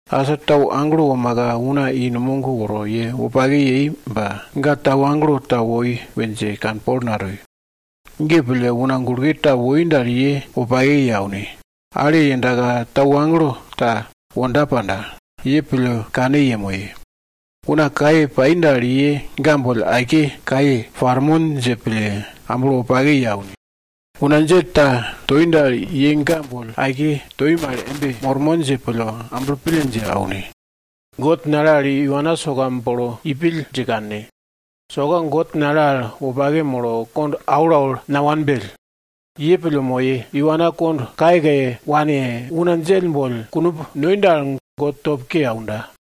Asa tau agelo womaka una i numog woro ye wopake yei ba ga tau agelo ta woi we dje kanpol natoi. Ge pille una gulke ta woi dal ye wopake ye aune. Ale yendaka tau agelo ta wonda panda? Ye pille kane yemoye. Una kaye pai dal, ye ga boll aike kaye parmon dje pille amblo wopake ye aune. Una djell ta toi dal, ye ga boll aike toi mal embe mormon dje pille amblo pille dje aune. God nale al iwana soka bolo ipill dje kanne. Soka God nale al wopake molo, kond aulaul nawanbell. Ye pille moye, iwana kond kayekaye wane, una djell boll kunumb noi dal, God top ke aunda.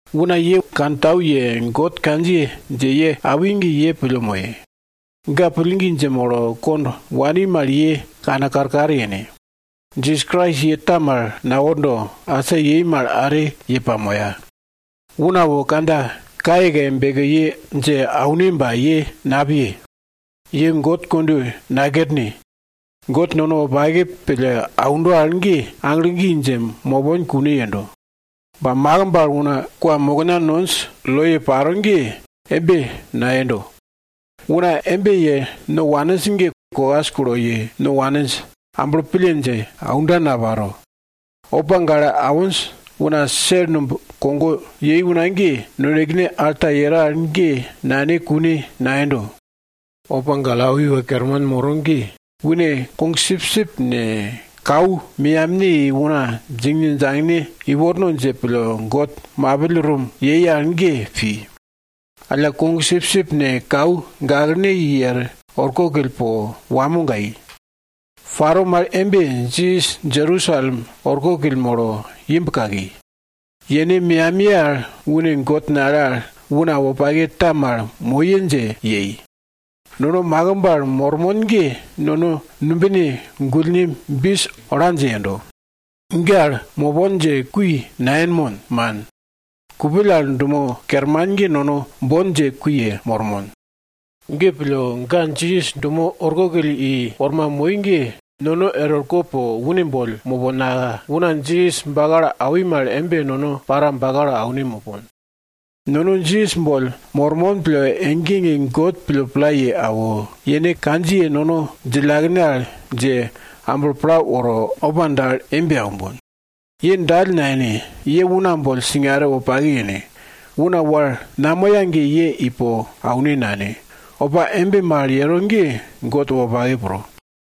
Una ye kantau ye God kandjiye dje ye awi ge, ye pille moye. Ga pillgi dje molo kond wani mal ye kane karkar yene. Jisas Krais ye ta mal nawordo, asa yei mal are ye pamoya. Una wo kandja kayekaye beke ye dje aune ba ye napiye. Ye God kondweye nakerne. God nono wopake pille aundo al ge, aglo gi dje mopon kune yendo. Ba makimb al kwamokna nonj loye paro ge, embe nayendo. Una embe ye no waninj ge kokas kulo ye no waninj, amblo pille dje aunda naparo. Opa gale awinj una sel numb kogo yei una ge, nonekene alta yero al ge nane kune nayendo. Opa gale awi una iwa kerman moro ge une kogsipsip ne, kau meyamne i una djingne djangne iworno dje pille God mapill rum yei al ge pi. Alla, kogsipsip ne, kau gaklene i er orkokill po wamo gai. Paro mal embe, Jisas Jerusalem orkokill molo imb kaki. Yene meyamiye al une God nale al una wopake ta mal moye dje yei. Nono makimb al mormon ge nono numbine gullne bis ola dje yendo. Ge al mopon dje kui nayenmon, man. Kupill al dumo kerman ge, nono bon dje kui yemormon. Ge pille, ga Jisas dumo orkokill i wormaka moi ge, nono er orko po une boll moponka, una Jisas bakalo awi mal embe nono para bakalo aune mopon. Nono Jisas boll mormon pille, ege ege God pille pla ye awo, yene kandjiye nono djillakene al dje, amblo pla woro opa dal embe aumbon. Ye dall nayene. Ye una boll singare wopake yene. Una wal namoya ge ye ipo aune nane. Opa embe mal yero ge God wopake pro.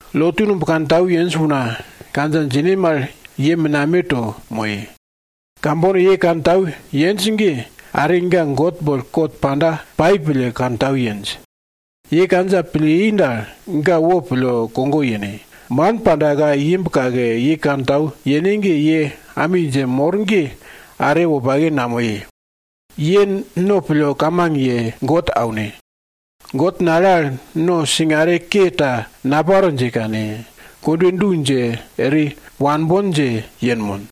Lotu numb kantau yenj una kandja djine mal ye menameto moye. Kambono ye kantau yenj ge, are ga God boll kot panda pai pille kantau yenj. Ye kandja pille i dal, ga wopille kogo yene. Man pandaka imb kake ye kantau yene ge, ye ami dje mor ge are wopake namoye. Ye no pille kamang ye God aune. God nale al no singare ke ta naparo dje kane, kondwe du dje eri wanbon dje yenmon.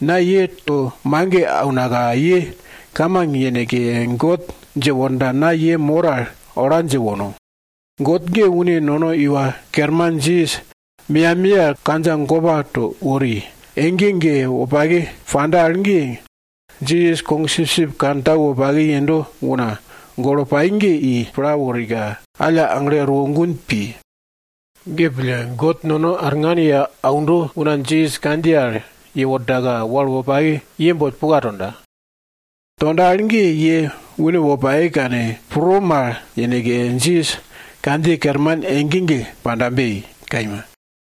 Na ye to mage aunaka ye kamang yeneke God dje worda na ye mor al ola dje wono. God ge une nono Iwa Kerman Jisas meyamiye al kandja gopa to wori, ege ege wopake panda al ge, Jisas sipsip kantau wopake yendo una golo pai ge i pla worika alla aglo erwo gun pi. Ge pille, God nono arngan ye aundo una Jisas kandjiye al yewordaka wal wopake ye boll puka tonda. Tonda al ge, ye une wopake kane pro mal yeneke, Jisas kandjiye kerman ege ege pandabe! Kaima.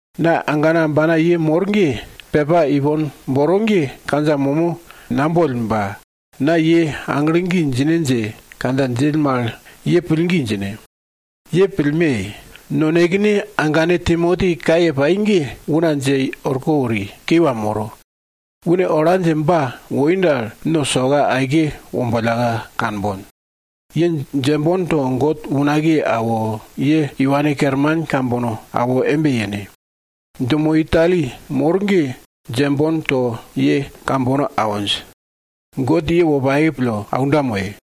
Na agana ambana ye mor ge, pepa ipon boro ge kandja momo naboll ba, na ye aglo gi djine dje kandja djill mal ye pillgi djine. Ye pillme! Nonekene agane Timoti kaye pai ge una dje orko wori, kiwa moro. Une ola dje ba woi dal, no soka aike wombollka kanbon. Ye djembon to God unakiye awo, ye iwane kerman kambono awo embe yene. Dumo Itali mor ge djembon to ye awinj. God ye wopake pille aunda moye.